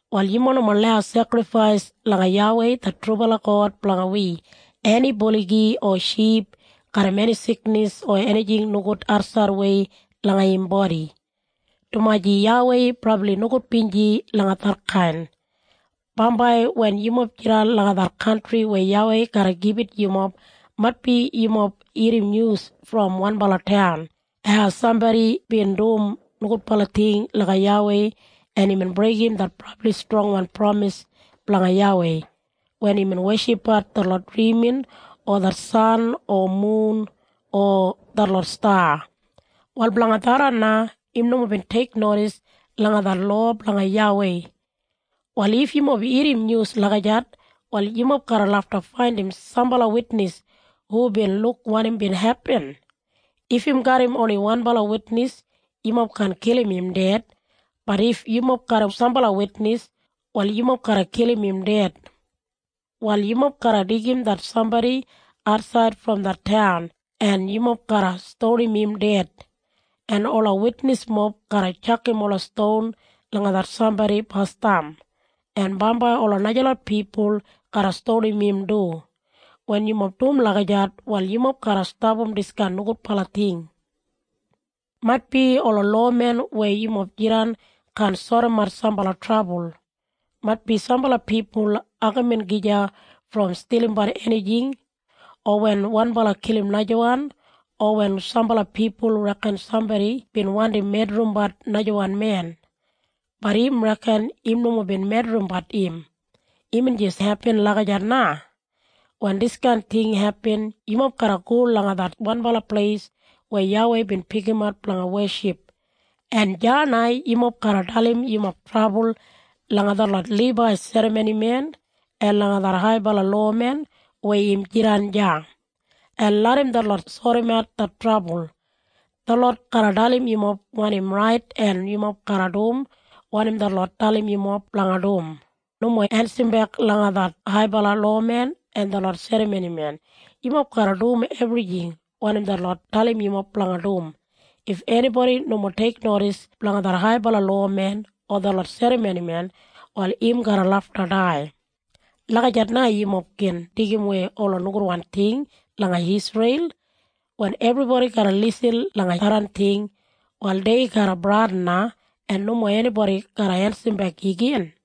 “Wal yumob nomo lau sekrifais langa YAWEI det trubala God blanga wi eni buligi o ship garram eni siknis o enijing nogud atsaidwei langa im bodi, dumaji YAWEI brabli nogudbinji langa detkain. “Bambai wen yumob jidan langa det kantri weya YAWEI garra gibit yumob maitbi yumob irrim nyus brom wanbala taun, hau sambodi bin dum nogudbala ting langa YAWEI en imbin breigim det brabli strongwan pramis blanga YAWEI wen imbin weshipbat detlot drimin o det san o mun o detlot sta. Wal blanga tharran na im nomo bin teiknodis langa det lowa blanga YAWEI. Wal if yumob irrim nyus lagijat wal yumob garra lafta faindim sambala witnis hu bin luk wanim bin hepin. If im garram oni wanbala witnis yumob kaan kilim im ded, bat if yumob garram sambala witnis, wal yumob garra kilim im ded. Wal yumob garra deigim det sambodi atsaid brom det taun en yumob garra stonim im ded. En ola witnismob garra tjakam ola ston langa det sambodi basdam, en bambai ola najalot pipul garra stonim im du. Wen yumob dum lagijat wal yumob garra stapam diskain nogudbala ting. “Maitbi ola lowamen weya yumob jidan kaan sodimat sambala trabul. Maitbi sambala pipul agamin gija brom stilimbat enijing, o wen wanbala kilim najawan, o wen sambala pipul reken sambodi bin wandim medrimbat najawan men, bat im reken im nomo bin medrimbat im, imbin jis hepin lagijat na. Wen diskain ting hepin yumob garra go langa det wanbala pleis weya YAWEI bin pikimat blanga weship. En deya na yumob garra dalim yumob trabul langa detlot Libai serramonimen en langa det haibala lowamen weya im jidan deya, en larram detlot sodimat det trabul. Detlot garra dalim yumob wanim rait en yumob garra dum wanim detlot dalim yumob blanga dum. Nomo ensabek langa det haibala lowamen en detlot serramonimen. Yumob garra dum ebrijing wanim detlot dalim yumob blanga dum. If enibodi nomo teiknodis blanga det haibala lowamen o detlot serramonimen wal im garra lafta dai. Lagijat na yumob gin deigimwei ola nogudwan ting langa Isreil. Wen ebribodi garra lisin langa tharran ting, wal dei garra bradin na en nomo enibodi garra ensabek igin.”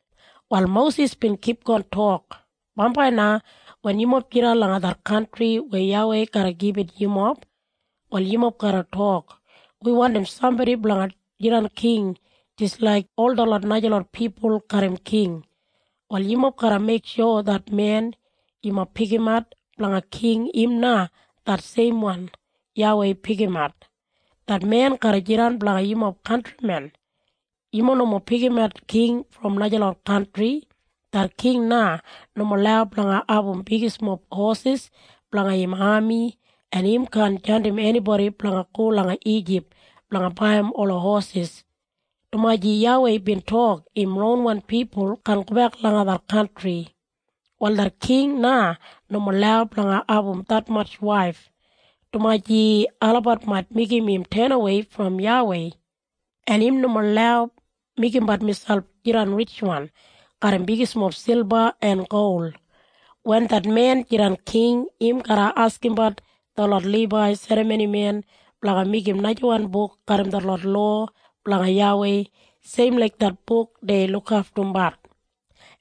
Wal Mosis bin kipgon tok, “Bambai na wen yumob jidan langa det kantri weya YAWEI garra gibit yumob, wal yumob garra tok, ‘Wi wandim sambodi blanga jidan king jis laik ol detlot najalot pipul garram king.’ Wal yumob garra meiksho det men yumob pikimat blanga king im na det seimwan YAWEI pikimat. Det men garra jidan blanga yumob kantrimen. Yumob nomo pikimat king brom najalot kantri. Det king na nomo lau blanga abum bigmob hosis blanga im ami en im kaan jandim enibodi blanga go langa Ijip blanga baiyim ola hosis, dumaji YAWEI bin tok im ronwan pipul kaan gobek langa det kantri. Wal det king na nomo lau blanga abum detmatj waif, dumaji olabat mait meigim im tenawei brom YAWEI. En im nomo lau meigimbat miselp jidan ritjwan garram bigmob silba en gol. Wen det men jidan king im garra askimbat detlot Libai serramonimen blanga meigim najawan buk garram detlot lowa blanga YAWEI seim laik det buk dei lukaftumbat.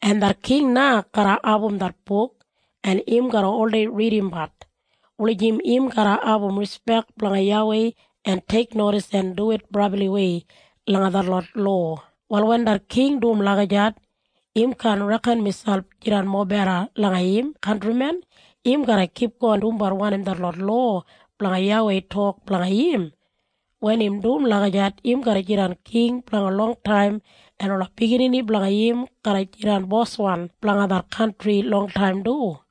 En det king na garra abum det buk en im garra oldei ridimbat, wulijim im garra abum rispek blanga YAWEI en teiknodis en duwit brabliwei langa detlot lowa. Wal wen det king dum lagijat, im kaan reken miselp jidan mobeda langa im kantrimen. Im garra kipgon dumbat wanim detlot lowa blanga YAWEI tok blanga im. Wen im dum lagijat im garra jidan king blanga longtaim en ola biginini blanga im garra jidan boswan blanga det kantri longtaim du.”